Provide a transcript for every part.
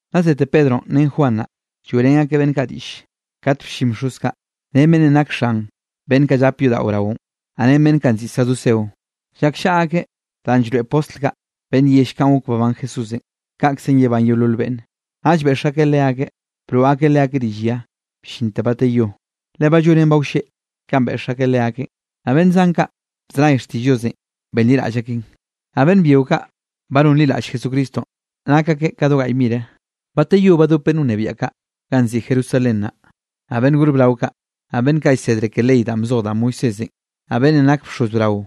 Nna zete Pedronꞌ ren Juan naꞌ, lloeꞌrén akeꞌ beꞌnn kaꞌ diꞌll kat bllin bxoz kaꞌ ren beꞌnnenꞌ nak xan beꞌnn kaꞌ llap yodaꞌo braonꞌ, naꞌ ren beꞌnn kaꞌ nziꞌi saduceo. Llakllaꞌa akeꞌ danꞌ llroeꞌ postl kaꞌ beꞌnn yell kanꞌ gok babán Jesúsenꞌ, kaꞌkzenꞌ yebán yeolol beꞌnne. Naꞌll beꞌx akeꞌ leakeꞌ, broꞌ akeꞌ leakeꞌ rill ya bllinte bateyó, le ba llonen ba wlleꞌ kanꞌ beꞌx akeꞌ leakeꞌn. Naꞌ beꞌnn zan kaꞌ bzenay xtiꞌll Diosenꞌ benliraꞌll akeꞌn, naꞌ beꞌnn byio kaꞌ ba nonliraꞌll Jesucristonꞌ, nak akeꞌ do gaꞌy mire. Bateyó badop beꞌnn wnebiaꞌ kaꞌ ganꞌ nziꞌi Jerusalén naꞌ, naꞌ beꞌnn gor brao kaꞌ, naꞌ beꞌnn kaꞌ llsedre ke ley danꞌ bzoj da Moisésenꞌ, naꞌ beꞌnnenꞌ nak bxoz brao,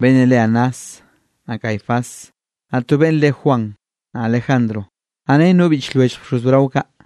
beꞌnnenꞌ re Anás, naꞌ Caifás, naꞌ to beꞌnn re Juan, naꞌ Alejandro, naꞌ ren no biꞌch lwellj bxoz brao kaꞌ.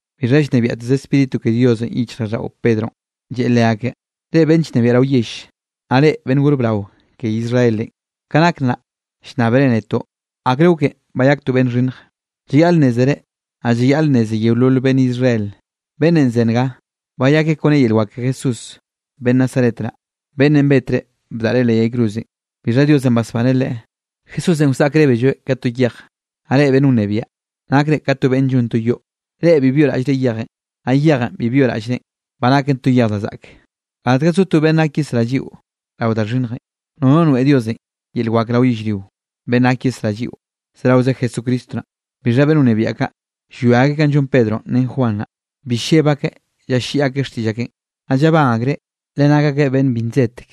Bixha llnebiaꞌteze Spíritu ke Diosenꞌ yichjraꞌlldaꞌo Pedronꞌ, lleꞌe leakeꞌ: —Reꞌ beꞌnn llnebiaꞌ rao yell, naꞌ reꞌ beꞌnn gor brao ke Israelenꞌ, ka nak nnaꞌ llnnábere netoꞌ akre goken bayak to beꞌnn xhinnj. Llayaꞌl nnézere, naꞌ llayaꞌl nneze yeolol beꞌnn Israel, beꞌnnenꞌ ze nga, bayakeꞌ kone yel wak ke Jesús beꞌnn Nazaret naꞌ, beꞌnnenꞌ betre bdaꞌre leꞌ yay cruzenꞌ, bixha Diosenꞌ basbaneꞌ Leꞌe. Jesúsenꞌ wsaꞌkrébelloeꞌ ka to yej, naꞌ reꞌ beꞌnn wnebiaꞌ nakre ka beꞌnn llon to yoꞌ. Reꞌ bi byoꞌraꞌllre yejenꞌ, naꞌ yejenꞌ bi byoꞌraꞌllrenꞌ, ba naken to yej da zaꞌke. Gatga zo to beꞌnn gak yesrá lliꞌo rao da xhinnjenꞌ, nono noeꞌ Diosenꞌ yel wak rao yellrio, beꞌnn gak yesrá lliꞌo, zeraoze Jesucristo naꞌ. Bixha beꞌnn wnebiaꞌ kaꞌ, llwia akeꞌ kanꞌ llon Pedronꞌ ren Juan naꞌ, bi lleb akeꞌ llalliꞌi akeꞌ xtiꞌll akeꞌn. Naꞌ llabán akreꞌ, le nak akeꞌ beꞌnn bi nsedtek.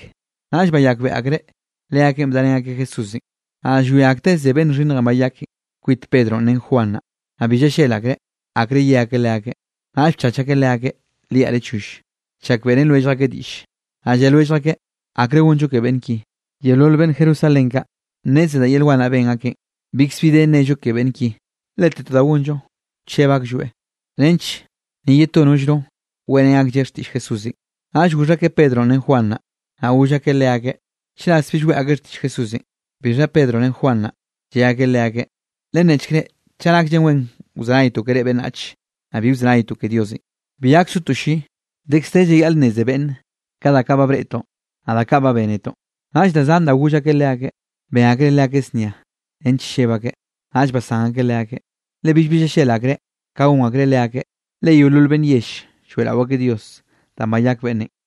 Naꞌll bayakbeꞌe akreꞌ leakeꞌn bdarén akeꞌ Jesúsenꞌ. Naꞌ llwia akteꞌ ze beꞌnn xhinnjenꞌ bayakenꞌ kwit Pedronꞌ ren Juan naꞌ, naꞌ bi llallel akreꞌ, akre ye akeꞌ leakeꞌ. Naꞌll bchach akeꞌ leakeꞌ liaꞌre choll, chak beꞌrén lwellj akeꞌ diꞌlle. Naꞌ lle lwellj akeꞌ: —¿Akre gonllo ke beꞌnn ki? Yeolol beꞌnn Jerusalén kaꞌ, nneze da yel wan naꞌ ben akeꞌn, bikzbi de nnello ke beꞌnn ki. Lete to da gonllo wcheb aklloeꞌ, nench ni ye to nollno weꞌrén aklleꞌ xtiꞌll Jesúsenꞌ. Naꞌll goxh akeꞌ Pedronꞌ ren Juan naꞌ, naꞌ goll akeꞌ leakeꞌ, chras bill weꞌe akeꞌ xtiꞌll Jesúsenꞌ. Bixha Pedronꞌ ren Juan naꞌ, lle akeꞌ leakeꞌ: —Lennechk reꞌ chaꞌ nakllen wen wzenaytoꞌ ke reꞌ beꞌnnach, naꞌ bi wzenaytoꞌ ke Diosenꞌ. Bi gak sotoꞌ lli, dekz de llayaꞌl nneze beꞌnn kaꞌ da kaꞌ ba breꞌtoꞌn, naꞌ da kaꞌ ba bénetoꞌ. Naꞌll da zan da goll akeꞌ leakeꞌ, ben akreꞌ leakeꞌ znia nench lleb akeꞌ. Naꞌll basán akeꞌ leakeꞌ, le billbi llallel akreꞌ ka gon akreꞌ leakeꞌ, le yeolol beꞌnn yell lloeꞌrao akeꞌ Dios danꞌ bayak beꞌnnenꞌ.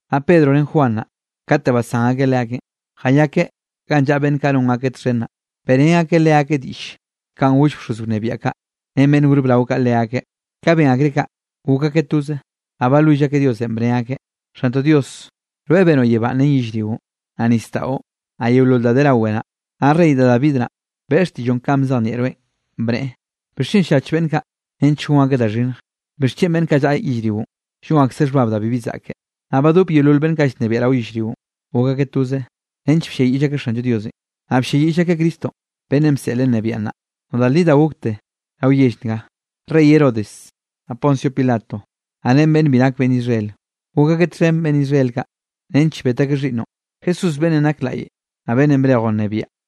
Naꞌ Pedronꞌ ren Juan naꞌ, kate basán akeꞌ leakeꞌn, jayakeꞌ ganꞌ llaꞌa beꞌnn kaꞌ non akeꞌ txhen naꞌ, beꞌrén akeꞌ leakeꞌ diꞌll, kanꞌ goll bxoz wnebiaꞌ kaꞌ ren beꞌnn gor brao kaꞌ leakeꞌ. Ka ben akreꞌ kaꞌ, gok akeꞌ toze, naꞌ balwill akeꞌ Diosenꞌ, bne akeꞌ: —Xantoꞌ Dios, rweꞌ benoꞌ yebá ren yellrio, naꞌ nisdaꞌo, naꞌ yeolol da de rawe naꞌ. Naꞌ rey da David naꞌ, beꞌe xtiꞌlloꞌ kanꞌ bzejnieꞌroeꞌn, bneꞌe: ¿Bixchen llach beꞌnn kaꞌ nench gon akeꞌ da xhinnj? ¿Bixchen beꞌnn kaꞌ llaꞌa yellrionꞌ llon akzeꞌ xhbab da bibi zaꞌke? Naꞌ badop yeolol beꞌnn kaꞌ llnebiaꞌ rao yellrionꞌ, gok akeꞌ toze nench blliayiꞌll akeꞌ Xanllo Diosenꞌ, naꞌ blliayiꞌll akeꞌ Cristonꞌ beꞌnnenꞌ bseꞌleꞌ nnebiaꞌ naꞌ. ’Naꞌ da li da gokte rao yell nga, rey Herodes, naꞌ Poncio Pilato, naꞌ ren beꞌnn bi nak beꞌnn Israel, gok akeꞌ txhen beꞌnn Israel kaꞌ, nench bet akeꞌ xhiꞌnnoꞌn, Jesúsenꞌ beꞌnnenꞌ nak laꞌy, naꞌ beꞌnnenꞌ brejoꞌ nnebiaꞌ.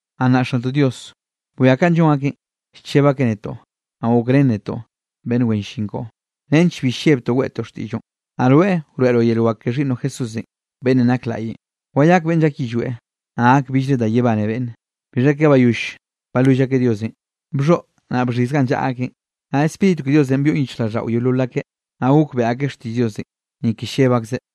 Naꞌ nnaꞌ Xantoꞌ Dios, bwia kanꞌ llon akeꞌn llcheb akeꞌ netoꞌ, naꞌ gokrén netoꞌ beꞌnn wen llin koꞌo, nench bi llebtoꞌ weꞌtoꞌ xtiꞌlloꞌn. Naꞌ rweꞌ wroeꞌroꞌ yel wak ke xhiꞌnnoꞌ Jesús, beꞌnnenꞌ nak laꞌyenꞌ, wayak beꞌnn llak yillweꞌ, naꞌ gak billre da yebane beꞌnne. Bixha ke bayoll balwill akeꞌ Diosenꞌ, bxhoꞌ naꞌ bxhiz ganꞌ llaꞌa akeꞌn, naꞌ Spíritu ke Diosenꞌ byoꞌn yichjraꞌlldaꞌo yeolol akeꞌ, naꞌ gok beꞌe akeꞌ xtiꞌll Diosenꞌ, ni ke lleb akzeꞌ.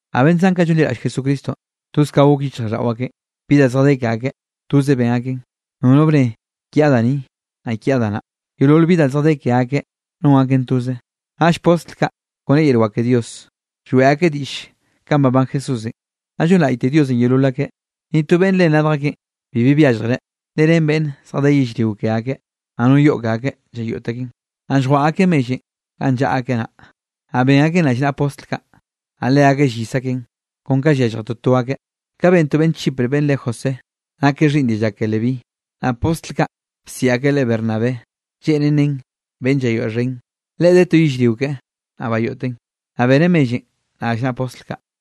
Naꞌ beꞌnn zan kaꞌ llonliraꞌll Jesucristonꞌ, toze ka gok yichjraꞌlldaꞌo akeꞌ. Bi da zjadé ke akeꞌ, toze ben akeꞌn, nono bne: “Kiaꞌ da ni”, naꞌ “Kiaꞌ da naꞌ”. Yeolol bi da zjadé ke akeꞌ non akeꞌn toze. Naꞌll postl kaꞌ, kone yel wak ke Dios, lloeꞌ akeꞌ diꞌll kanꞌ babán Jesúsenꞌ, naꞌ llonlaꞌyte Diosenꞌ yeolol akeꞌ. Ni to beꞌnn ren radj akeꞌn bibi byalljreꞌ, le ren beꞌnn zjadé yellrio ke akeꞌ, naꞌ no yoꞌ ke akeꞌ llayoꞌt akeꞌn, naꞌ lljwaꞌa akeꞌ mellenꞌ ganꞌ llaꞌa akeꞌ naꞌ. Naꞌ ben akeꞌn rallnaꞌa postl kaꞌ, naꞌ leakeꞌ llyis akeꞌn kon ka yallje toto akeꞌ. Ka ben to beꞌnn Chipre beꞌnn re José, nakeꞌ xhiꞌnn dialla ke Leví, naꞌ postl kaꞌ bsiꞌi akeꞌ leꞌe Bernabé, lleꞌnen nen Beꞌnn Llayoeꞌxhen. Leꞌe de to yellrio keꞌe, naꞌ bayoꞌteꞌn, naꞌ beneꞌ mellenꞌ rallnaꞌa postl kaꞌ.